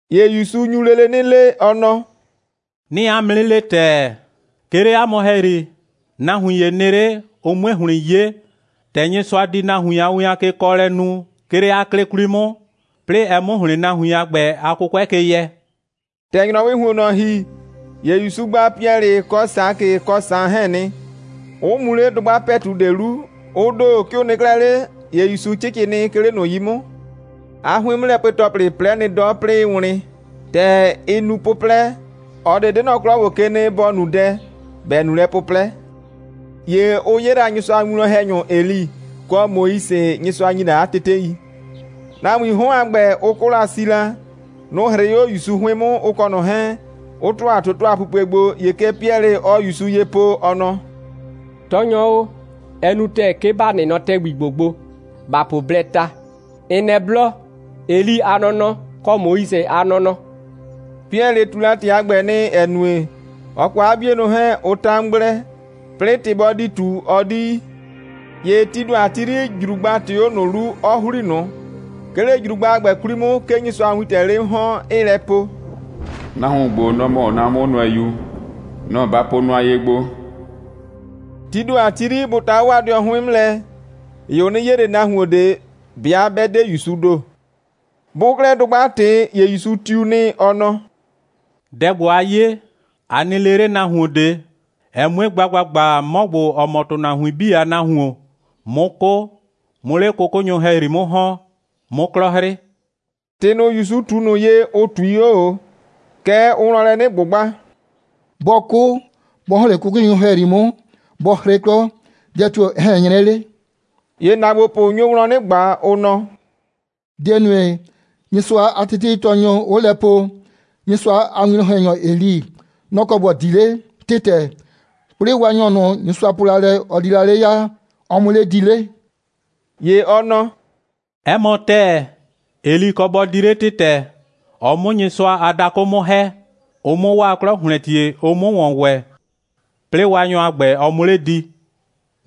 ‑Ye ‑Yusu nyu lele 'nɩ le, ɔ nɔ: «'Nɩɩ 'a mʋ 'nɩ le ‑tɛɛ, 'ke 'le 'a mʋ ‑hɛyri, nahuin ‑ye nɩ 'le, ʋ 'mue ‑hlɩn 'ye, ‑tɛ Nyɩsʋa di nahuin a win a kekɔɔlɛ nu, 'ke 'le 'a 'klɩ 'kwli 'mʋ, 'plɩɩ ɛ 'mʋ ‑hlɩn nahuin a ‑gbɛ a 'kʋkʋɛ ke yɛ.» ‑Tɛ ‑nyrɔwɩɩ ‑huonnɔ ‑hi, ‑ye ‑Yusu gba Piɛlɩ kɔ Sakɩ kɔ Saan 'hɛɛn nɩ, 'ʋ mu 'le dʋgba ‑pɛtu ꞊de 'lu. Ʋ ‑do, 'ke ʋ nɩ 'klɛɛ 'le, ‑ye ‑Yusu 'cɩcɩ nɩ, 'ke 'le ꞊nʋ 'yi 'mʋ. 'A 'hʋɩn'mʋlɛpue‑tɔplɩ 'plɛ nɩ 'dɔ, 'plɩɩ 'ɩɩ wlɩn. ‑Tɛ ɩ nu 'pʋplɛ, ꞊ɔ ꞊de 'de nɔ 'klɔ ‑gbo ke nɩ, ‑bɔ nu dɛ, ‑bɛ nu lɛ 'pʋplɛ. ‑Ye ʋ 'ye Nyɩsʋa a winwlɔn‑hɛnyʋ Eli, kɔ Moise, Nyɩsʋa ‑nye la 'a tetei. Nahuiin 'hɔn a ‑gbɛ, ʋ 'kʋ la si la. Nʋ‑ 'hrɩɩ 'o ‑Yusu 'hʋɩn 'mʋ, ʋ kɔ ꞊nɔ 'hɛɛn, 'ʋ ‑tʋa toto a pupue gbo. ‑Ye kɛ Piɛlɩ, ɔɔ ‑Yusu ye po, ɔ nɔ: «Tɔɔnyɔ o, ɛ nu ‑tɛɛ, 'ke ‑ba nɩ nɔ ‑tɛgbi ‑gbo gbo, ‑ba po blɛɛ ta, ‑n nɛ blɔ, Eli a nɔnɔ, kɔ Moise a nɔnɔ.» Piɛlɩ ꞊tu ‑tɩ a ‑gbɛ nɩ, ‑ɛ nue, ɔ kɔ 'a 'bienʋ 'hɛɛn, ʋ 'ta 'mʋ gblɛ, 'plɩɩ ‑tɩ bɔ di ꞊tu, ɔ 'di yi. ‑Ye tii ‑do a ti 'yri, ‑jrugba ꞊tɩɩ 'o ꞊nʋ 'lu, 'ɔ ‑hli ꞊nʋ. 'Ke 'le ‑jrugba a ‑gbɛ 'kwli 'mʋ, 'ke Nyɩsʋa a wiin 'le 'mʋ ‑hɔn, 'ɩɩ lɛ po: «Nahuon ‑gbo, nɔ‑ mɔ 'na 'mʋnʋɛyu. Nɔ‑ ba po nʋa ye gbo!» Tii ‑do a ti 'yri, bʋ ta 'o 'waa dɩɔnʋ 'hʋɩn 'mʋ lɛ, ‑ye ʋ 'nɩ 'ye ꞊le nahuon ꞊de, 'bɩa 'bɛ 'de ‑Yusuu ‑do. Bʋʋ 'klɛɛ dʋgba ꞊tɩ, ‑ye ‑Yusu tiu nɩ, ɔ nɔ: «Dɛ ‑gbo, a 'ye, a nɩ le 'le nahuon ꞊de, ɛ 'mue gba ‑gbagba, 'mɔ ‑gbo, ‑ɔ mɔ ‑tʋnahuin 'bii a Nahuon, 'mʋ 'kʋ, 'mʋ 'le 'kʋkʋnyʋ ‑hɛyri 'mʋ ‑hɔn, 'mʋ 'klɔ 'hrɩ.» ‑Tɩ ꞊nʋ, ‑Yusu ꞊tu ꞊nʋ ye, ʋ ꞊tui 'o ꞊o. Kɛɛ, ʋʋ wlɔn lɛ 'nɩ ꞊gbʋgba: «Bɔ 'kʋ, bɔ ‑hɔn 'le 'kʋkʋnyʋ ‑hɛyri 'mʋ, bɔ 'hrɩ 'klɔ, dɛ tio‑ ɛ ꞊hɛn 'nyrɛ 'le?» ‑Ye ‑naagbopʋ nyo wlɔn 'nɩ ꞊gba, ʋ nɔ: «Dɛ‑ nue, Nyɩsʋa a teteitɔɔnyʋ 'ʋʋ lɛ po, Nyɩsʋa a winwlɔn‑hɛnyɔ Eli, nɔ‑ kɔ ‑bɔ di 'le ‑tɩtɛ, 'plɩɩ Waanyɔ ꞊nʋ, Nyɩsʋa po la lɛ, ɔ di la 'le ya, ɔ 'mʋ 'le di 'le?» ‑Ye ɔ nɔ: «'Ɛ mɔ ‑tɛɛ, Eli kɔ bɔ di 'le ‑tɩtɛ, ɔ 'mʋ Nyɩsʋa a dakʋ 'mʋ ‑hɛ, ʋ 'mʋ 'waa 'klɔ ‑hlɛntie, ʋ 'mʋ ‑wɔn ‑wɛ, 'plɩɩ Waanyɔ a ‑gbɛ, ɔ 'mʋ 'le di.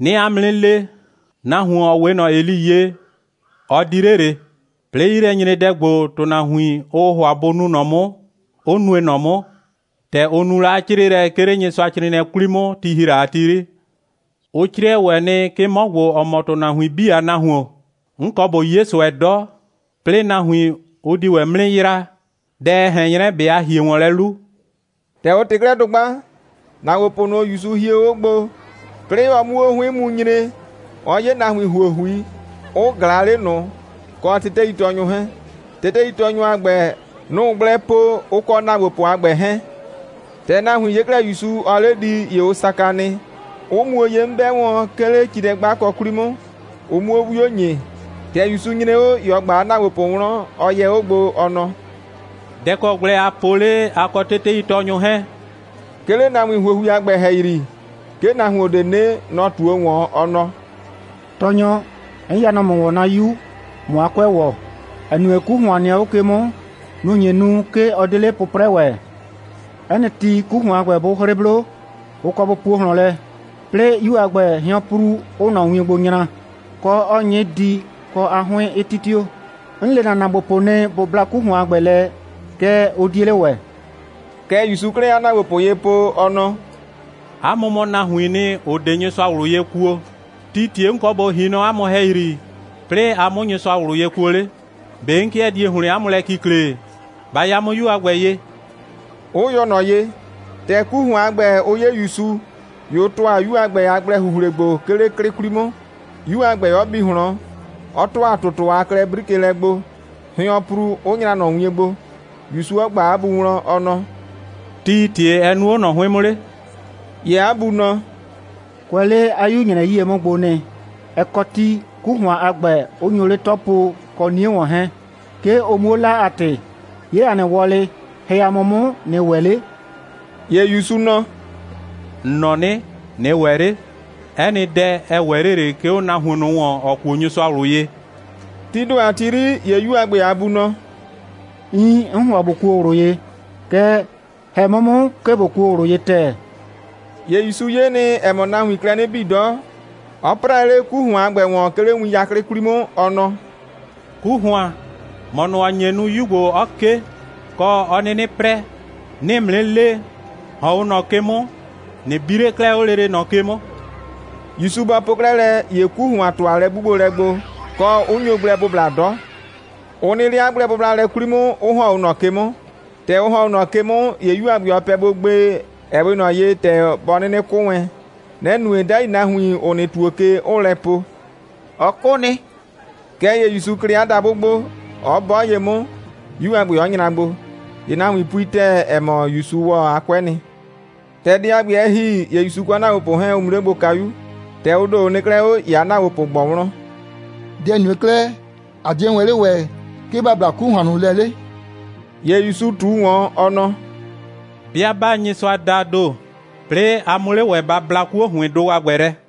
'Nɩɩ 'a mʋ 'nɩ le: Nahuon, ‑ɔ 'we ꞊nɔ Eli ye, ɔ di 'le ꞊le, 'plɩɩ 'yilɛnyredɛ ‑gbo, ‑tʋnahuin, ʋʋ ‑hʋa bʋ nu ꞊nɔ 'mʋ, 'ʋ nue ꞊nɔ 'mʋ, ‑tɛ ʋ nu la 'a 'crɩɩlɛ, 'ke 'le Nyɩsʋacrɩɩnɩɛ 'kwli 'mʋ, ti ‑hi la ti 'yri. Ʋ 'crɩɛ ‑wɛ nɩ, 'ke 'mɔ ‑gbo, ‑ɔ mɔ ‑tʋnahuin 'bii a Nahuon, 'n kɔ ꞊bo 'ye ꞊sʋɛ 'dɔ, 'plɩɩ nahuin, ʋ di ‑wɛ 'mʋ 'nɩ yraa. Dɛ ɛ ꞊hɛn 'nyrɛ, ꞊be a ‑hie ‑wɔn lɛ 'lu?» ‑Tɛ ʋ ꞊tɩ 'klɛɛ dʋgba, ‑naagbopʋ ꞊nʋ, ‑Yusu hie 'o gbo, 'plɩɩ ɔ 'mu 'o 'hʋɩn 'mʋ mu nyre, ɔ 'ye nahuin ‑huohui, 'ʋ ꞊glaa 'le ꞊nʋ, kɔ teteitɔɔnyʋ 'hɛɛn. Teteitɔɔnyʋ a ‑gbɛ, nʋ‑ʋ gblɛ po, ʋ kɔ ‑naagbopʋ a ‑gbɛ 'hɛɛn. ‑Tɛ nahuin 'ye 'klɛɛ ‑Yusu, ‑ɔɔ 'le di, ‑ye ʋ saka nɩ, 'ʋ muo ye 'mʋ 'bɛ wɔn, 'ke 'le cilɛ'gbakɔ 'kwli 'mʋ, ʋ 'muo 'wio ‑nyi. ‑Tɛ ‑Yusu nyre 'o, ‑ye ɔ ꞊gba 'a ‑naagbopʋ wlɔn, ɔ yɛ 'o gbo, ɔ nɔ: «Dɛ‑ kɔ gblɛ aa po 'le, a kɔ teteitɔɔnyʋ 'hɛɛn?» 'Ke 'le nahuin ‑huohui a ‑gbɛ ‑hɛyri, 'ke nahuon ꞊de nɩ 'le. Nɔ‑ ꞊tuo ‑wɔn, ɔ nɔ: «Tɔɔnyɔ, 'n ya nɔ ‑mʋ ‑wɔn 'na 'yu, ꞊mʋ 'a 'kʋɛ ‑wɔ, ‑ɛ nue, 'ku ‑hʋan nɩ 'o ꞊nɔ ke 'mʋ. Nʋ‑ nye nu, 'ke ɔ 'de 'le 'pʋprɛ ‑wɛ. 'Ɛ nɩ ti, 'ku ‑hʋan a ‑gbɛ 'bʋ 'hrɩ 'blo, ʋ kɔ bʋ puo ꞊hlɔn lɛ, 'plɩɩ 'yu a ‑gbɛ, hɩɔnpru 'ʋʋ ꞊nɔ wien gbo nyra, kɔ, 'ɔɔ 'nyɩ di, kɔ, 'a 'hʋɩn 'ɩ 'titio. 'N le ‑na ‑naagbopʋ nɩ, bʋ bla 'ku ‑hʋan a ‑gbɛ lɛ, kɛɛ, ʋ 'die 'le ‑wɛ.» Kɛ ‑Yusuu 'klɛɛ 'a ‑naagbopʋ ye po, ɔ nɔ: «'A mʋ mɔ nahuiin nɩ, ‑ʋ 'de Nyɩsʋa ꞊wlʋ ye kuo. Tii ‑tie 'n kɔ ꞊bo ‑hi nɔ 'a mʋ ‑hɛyri, 'plɩɩ a 'mʋ Nyɩsʋa ꞊wlʋ ye kuo 'le? ꞊Be 'n 'kɩɛ die ‑hlɩn 'a mʋ lɛ kikle? Ba ya 'mʋ 'yu a ‑gbɛ ye!» 'ʋ yɔ ꞊nɔ ye. ‑Tɛ 'ku ‑hʋan 'ye ‑Yusu, ‑ye ʋ ‑tʋa 'yu a ‑gbɛ a gblɛ‑huhlilɛ gbo, 'ke 'le 'klɩ 'kwli 'mʋ, 'yu a ‑gbɛ 'ɔ bi ꞊hlɔn, 'ɔ ‑tʋa ‑tʋtʋ a klɛ'brikelɛ gbo, hɩɔnpru 'ʋ nyra ꞊nɔ wien gbo, ‑Yusu 'ɔ ꞊gba 'a bu wlɔn, ɔ nɔ: «Tii ‑tie ɛ nu 'o ꞊nɔ 'hʋɩn 'mʋ 'le?» ‑Ye 'a bu nɔ: «Kʋɛ 'le 'a 'yu‑nyrɛ 'yie 'mʋ gbo'o nɩ. Ɛ kɔ ti, 'ku ‑hʋan a ‑gbɛ 'ʋ nyo 'le 'tɔ po, kɔ 'nie ‑wɔn 'hɛɛn, 'ke ʋ 'muo 'la a ‑tɩ. 'Ye ‑a nɩ wɔlɩ, ‑hɛ ‑a mʋ 'mʋ, ꞊nɩ ‑wɛ 'le.» ‑Ye ‑Yusu nɔ: «‑N nɔ 'nɩ: ꞊Nɩ ‑wɛ 'le. 'Ɛ nɩ dɛ, ɛ ‑wɛ 'le ꞊le, 'ke 'o nahuon ꞊nʋ ‑wɔn, ‑ɔ kuo Nyɩsʋa ꞊wlʋ ye.» Tii ‑do a ti 'yri, ‑ye 'yu a ‑gbɛ a bu nɔ: «Iin, 'n ‑hʋa ꞊bo kuo ꞊wlʋ ye, kɛɛ, ‑hɛ 'mʋ 'mʋ, 'ke ꞊bo kuo ꞊wlʋ ye ‑tɛɛ.» ‑Ye ‑Yusu 'ye nɩ, ‑ɛ mɔ, nahuiin klɛ 'nɩ bii 'dɔ, 'ɔ 'prɛɛ 'le 'ku ‑hʋan a ‑gbɛ ‑wɔn, 'ke 'le win 'yaklɩ 'kwli 'mʋ, ɔ nɔ: «'Ku ‑hʋan, ‑mɔ ꞊nʋ, ‑ʋ nye nu, 'yu ‑gbo 'ɔ 'ke, kɔ, 'ɔ 'nɩnɩ 'prɛ, 'nɩɩ ‑mʋ 'nɩ le, ‑hɔn 'o ꞊nɔ ke 'mʋ, ꞊nɩ bi 'le 'klɛɛ 'o lele ꞊nɔ ke 'mʋ!» ‑Yusu bɔ po 'klɛɛ lɛ, ‑ye 'ku ‑hʋan ‑tʋa lɛ'gbugbolɛ gbo, kɔ, 'ʋ nyo gblɛ bʋbla 'dɔ. Ʋ nɩ 'le 'a gblɛbʋblalɛ 'kwli 'mʋ, 'ʋ ‑hɔn 'o ꞊nɔ ke 'mʋ. ‑Tɛ ʋ ‑hɔn 'o ꞊nɔ ke 'mʋ, ‑ye 'yu a ‑gbɛ, ɔ pɛ gbo gbee, ‑ɛ 'we ꞊nɔ ye, ‑tɛ bɔ 'nɩnɩ 'kʋ wɛn. Nɛ‑ nue, 'dai nahuin, ‑ʋ nɩ ‑tuo ke, 'ʋʋ lɛ po: «Ɔ 'kʋ nɩ.» Kɛɛ ‑ye ‑Yusu klɩ 'a dabʋ gbo, 'ɔ 'bɔ ye 'mʋ, 'yu a ‑gbɛ 'ɔ nyra gbo. ‑Ye nahuin pui ‑tɛɛ, ‑ɛ mɔ, ‑Yusu ‑wɔ 'a 'kʋɛ nɩ. ‑Tɛ dɛ a ‑gbɛ, ɛ ‑hi, ‑ye ‑Yusu kɔ 'a ‑naagbopʋ 'hɛɛn, ʋ mu 'le gbo kayu. ‑Tɛ ʋ ‑do, ʋ nɩ 'klɛɛ 'o, ‑ye 'a ‑naagbopʋ ꞊gbɔ wlɔn: «Dɛ‑ nue 'klɛɛ, ꞊a 'die wɛn 'le ‑wɛ, 'ke ‑ba bla 'ku ‑hʋan ꞊nʋ lɛ 'le?» ‑Ye ‑Yusu ꞊tu ‑wɔn, ɔ nɔ: «'Bɩa 'baa Nyɩsʋa daa ‑do, 'plɩɩ 'a 'mʋ 'le ‑wɛ ba bla 'kuo‑hʋɩndʋ a ‑gbɛ lɛ.»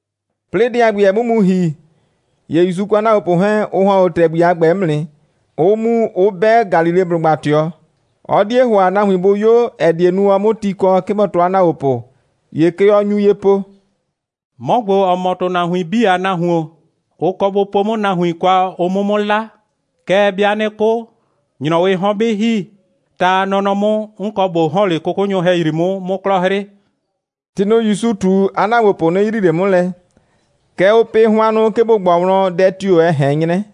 'Plɩɩ dɛ a ‑gbɛ, ɛ 'mʋ mu ‑hi, ‑ye ‑Yusu kɔ 'a ‑naagbopʋ 'hɛɛn, ʋ ‑hɔn 'o ‑tɛgbi a ‑gbɛ 'mʋ nɩ, 'ʋ mu, 'ʋ 'bɛ Galileblʋgba ꞊tɩɔ. Ɔ 'die ‑hʋa, nahuin ꞊de bʋ 'yo, ‑ɛ die nu, ɔ 'mʋ ti kɔ, 'ke bɔ tɔɔ 'a ‑naagbopʋ. ‑Ye kɛ ɔ nyu ye po: «'Mɔ ‑gbo, ‑ɔ mɔ ‑tʋnahuin 'bii a Nahuon, ʋ kɔ bʋ po 'mʋ nahuin kwa, ʋ 'mʋ 'mʋ 'la. Kɛɛ, 'bɩa 'nɩ 'kʋ, ‑nyrɔwɩɩ 'hɔn 'bɩ ‑hi, ta a nɔnɔ 'mʋ, 'n kɔ ꞊bo ‑hɔn 'le 'kʋkʋnyʋ ‑hɛyri 'mʋ, 'mʋ 'klɔ 'hrɩ.» ‑Tɩ ꞊nʋ, ‑Yusu ꞊tu, 'a ‑naagbopʋ 'nɩ yrii ꞊le 'mʋ lɛ. Kɛɛ, ʋʋ pɩ hʋannʋ, 'ke bʋ ꞊gbɔ wlɔn, dɛ tio‑ ɛ ꞊hɛn 'nyrɛ.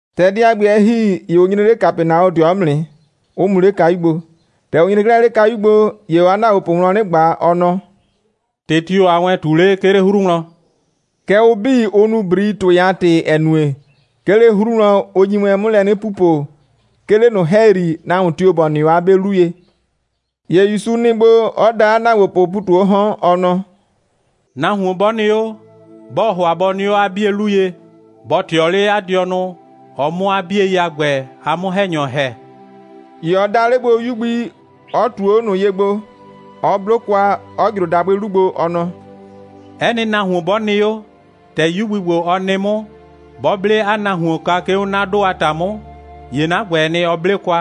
‑Tɛ dɛ a ‑gbɛ, ɛ ‑hi, ‑ye ʋ nyre 'le Kapɛnaɔdɩɔ 'mʋ nɩ, 'ʋ mu 'le kayu gbo. ‑Tɛ ʋ nyre 'klɛɛ 'le kayu gbo, ‑ye ɔɔ 'a ‑naagbopʋ wlɔn 'nɩ ꞊gba, ɔ nɔ: «‑Tɩ tio‑ aa wɛn ꞊tu 'le, 'ke 'le 'hru wlɔn?» Kɛɛ, ʋ 'bii, ʋ nu ‑brii, ‑tʋɩ a ‑tɩ, ‑ɛ nue, 'ke 'le 'hru wlɔn, ʋ nyi wɛn 'mʋ lɛ 'nɩ pupo, 'ke 'le ꞊nʋ ‑hɛyri, nahuon tio‑ ‑bɔ nɩ 'o 'a 'be 'lu ye. ‑Ye ‑Yusu nɩ gbo, 'ɔ da 'a ‑naagbopʋʋ ‑pu ꞊tu 'o 'hɔn, ɔ nɔ: «Nahuon 'bɔ nɩ 'o, 'bɔɔ ‑hʋa bɔ nɩ 'o 'a 'bie 'lu ye, bɔ ꞊tɩɔ 'le 'a dɩɔnʋ, ɔ 'mʋ 'a 'bie a ‑gbɛ a 'mʋ‑hɛnyɔ ‑hɛ.» ‑Ye ɔ da 'le gbo 'yu gbi, 'ɔ ꞊tuo 'o ꞊nʋ ye gbo, 'ɔ 'blo kwa, 'ɔ ꞊jro dabʋɩ 'lu gbo, ɔ nɔ: «'Ɛ nɩ nahuon 'bɔ nɩ 'o, ‑tɛ 'yu gbi ‑gbo, ɔ nɩ 'mʋ, 'bɔ 'ble 'a nahuon kwa, 'ke 'o 'na 'dʋ a ‑ta 'mʋ, ‑ye 'na ‑gbɛɛ nɩ, ɔ 'ble kwa,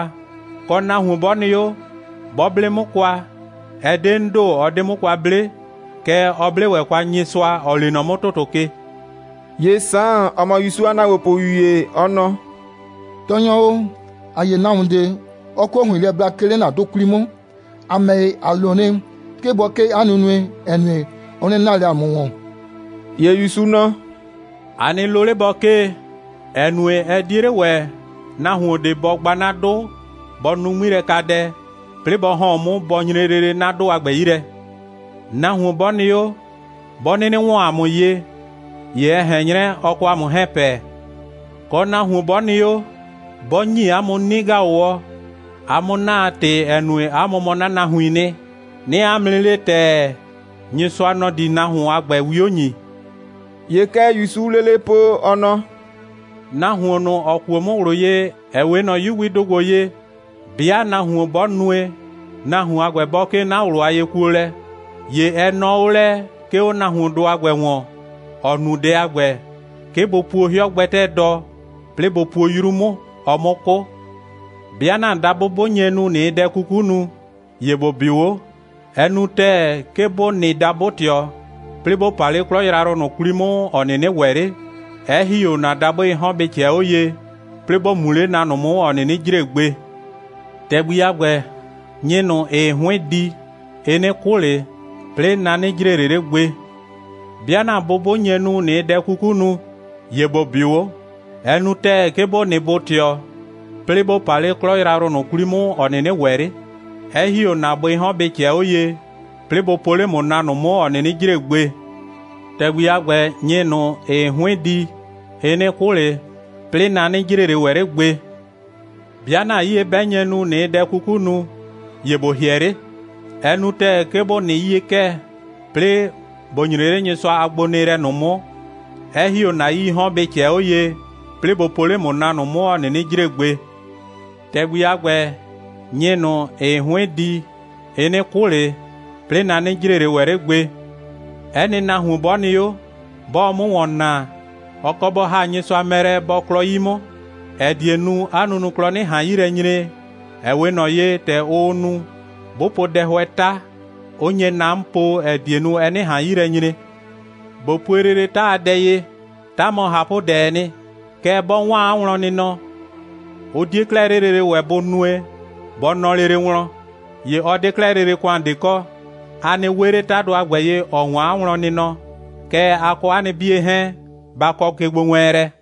kɔ, nahuon 'bɔ nɩ 'o, 'bɔ 'ble 'mʋ kwa, ɛ 'de 'n ‑do, ɔ 'de 'mʋ kwa 'ble, kɛɛ, ɔ 'ble ‑wɛ kwa Nyɩsʋa, ‑ɔ lee nɔ 'mʋ ‑tʋtʋ ke.» ‑Ye Saan, ‑ɔ mɔ ‑Yusu a ‑naagbopʋyu ‑ye, ɔ nɔ: «Tɔɔnyɔ, ‑a 'ye nahuon ꞊de, 'ɔɔ 'kuo ‑hʋɩn lɛ bla, 'ke 'le ‑na 'dʋ 'kwli 'mʋ. ‑A ‑mɛ ‑ye, ‑a lo nɩ, 'ke bɔ 'kee 'a nunue, ‑ɛ nue, ɔ 'nɩ naa ꞊le ‑a mʋ ‑wɔn.» ‑Ye ‑Yusu nɔ: «A nɩ lo 'le bɔ 'kee, ‑ɛ nue, ɛ 'die 'le ‑wɛ nahuon ꞊de bɔ gba 'na 'dʋ, bɔ nu 'ŋmilɛkadɛ, 'plɩɩ bɔ ‑hɔn 'o 'mʋ, bɔ nyre lele 'na 'dʋ a ‑gbɛ 'yi lɛ. Nahuon 'bɔ nɩ 'o, 'bɔ 'nɩnɩ ‑wɔn ‑a mʋ ye, ‑ye ɛ ꞊hɛn 'nyrɛ, ɔ kɔ ‑a mʋ 'hɛɛn pɛ. Kɔ, nahuon 'bɔ nɩ 'o, 'bɔ ‑nyi 'a mʋ 'nɩ‑gaʋwɔ, a 'mʋ 'na a ‑tɩ, ‑ɛ nue, 'a mʋ mɔ 'na nahuiin nɩ, 'nɩɩ 'a mʋ 'nɩ le ‑tɛɛ, Nyɩsʋa, nɔ‑ di nahuon a ‑gbɛ 'wio ‑nyi.» ‑Ye kɛ ‑Yusuu lele po, ɔ nɔ: «Nahuon ꞊nʋ, ‑ɔ kuo 'mʋ ꞊wlʋ ye, ‑ɛ 'we ꞊nɔ 'yu gbidʋ ‑gbo ye, 'bɩa nahuon 'bɔ nue, nahuon a ‑gbɛ bɔ 'kee 'na ꞊wlʋ a yekuolɛ, ‑ye ɛ nɔɔ 'o lɛ, 'ke 'o nahuondʋ a ‑gbɛ ‑wɔn, ‑ɔ nu dɛ a ‑gbɛ, 'ke bʋ puo 'hɩɔ gbɛtɛɛ dɔ, 'plɩɩ bʋ puo 'yru 'mʋ, ɔ 'mʋ 'kʋ. 'Bɩa ‑na dabʋ 'bʋ nye nu, ꞊nɩɩ dɛ 'kuku nu, ‑ye ‑bo 'bɩʋ 'o. Ɛ nu ‑tɛɛ, 'ke ‑bo nɩ dabʋ‑tɩɔ, 'plɩɩ ‑bo pa 'le 'klɔ yrayrʋ ꞊nʋ 'kwli 'mʋ, ‑ɔ 'nɩnɩ ‑wɛ 'le, 'ɛ ‑hi 'o ‑na dabʋɩɩ 'hɔn bɩ ꞊cɛɛ 'o ye, 'plɩɩ ‑bo mu 'le na ꞊nʋ 'mʋ, ‑ɔ 'nɩnɩ jre gbe. [ ‑Tɛgbi a ‑gbɛ, nyɩ ꞊nʋ, ‑ɩɩ 'hʋɩn di, ɩ 'nɩ 'kʋ ꞊le, 'plɩɩ na 'nɩ jre ꞊le ‑wɛ 'le gbe.] 'Bɩa ‑na bʋ 'bʋ nye nu, ꞊nɩɩ dɛ 'kuku nu, ‑ye ‑bo 'bɩʋ 'o. Ɛ nu ‑tɛɛ, 'ke ‑bo nɩ bʋ‑tɩɔ, 'plɩɩ ‑bo pa 'le 'klɔ yrayrʋ ꞊nʋ 'kwli 'mʋ, ‑ɔ 'nɩnɩ ‑wɛ 'le, 'ɛ ‑hie 'o ‑na bʋɩɩ 'hɔn, bɩ ꞊cɛɛ 'o ye, 'plɩɩ bʋ po 'le ‑mʋ na ꞊nʋ 'mʋ, ‑ɔ 'nɩnɩ jre gbe. [ ‑Tɛgbi a ‑gbɛ, nyɩ ꞊nʋ, ‑ɩɩ 'hʋɩn di, ɩ 'nɩ 'kʋ ꞊le, 'plɩɩ na 'nɩ jre ꞊le ‑wɛ 'le gbe.] 'Bɩa ‑na 'yie 'bɛ nye nu, ꞊nɩɩ dɛ 'kuku nu, ‑ye ‑bo ‑hɩɛ 'le. Ɛ nu ‑tɛɛ, 'ke ‑bo nɩ 'yie'kɛɛ, 'plɩɩ ‑bo nyre 'le Nyɩsʋa a gbonɩɩlɛ 'mʋ, 'ɛ ‑hi 'o ‑na 'yii 'hɔn bɩ ꞊cɛɛ 'o ye, 'plɩɩ bʋ po 'le ‑mʋ na ꞊nʋ 'mʋ, ‑ɔ 'nɩnɩ jre gbe. ‑Tɛgbi a ‑gbɛ, nyɩ ꞊nʋ, ‑ɩɩ 'hʋɩn di, ɩ 'nɩ 'kʋ ꞊le, 'plɩɩ na 'nɩ jre ꞊le ‑wɛ 'le gbe. 'Ɛ nɩ nahuon 'bɔ nɩ 'o, 'bɔɔ 'mʋ ‑wɔn naa, ɔ kɔ bɔ ‑ha Nyɩsʋa mɛ lɛ, bɔ klɔ 'yi 'mʋ, ‑ɛ die nu, 'a nunuklɔ 'nɩ ꞊han 'yi lɛ nyre, ‑ɛ 'we ꞊nɔ ye, ‑tɛ ʋʋ nu, 'bʋ po dɛhʋɛ 'ta, 'ʋ nye na 'mʋ po, ‑ɛ die nue, ɛ 'nɩ ꞊han 'yi lɛ nyre. ꞊Bo pue lele 'ta a dɛ ye. 'Ta mɔ ꞊hapʋdɛɛ nɩ. Kɛɛ, 'bɔ 'waan 'a wlɔnnɩnɔ, ʋ 'die 'klɛɛ 'le lele ‑wɛ bʋ nue, bɔ nɔ lele wlɔn. ‑Ye ɔ 'de 'klɛɛ lele ‑kʋan ꞊de kɔ. A nɩ 'we 'le ꞊nɔ 'tadʋ a ‑gbɛ ye, ‑ɔ 'waan 'a wlɔnnɩnɔ, kɛɛ, a kɔ 'a nɩ 'bie 'hɛɛn, ba kɔ kegbowɛɛnlɛ.»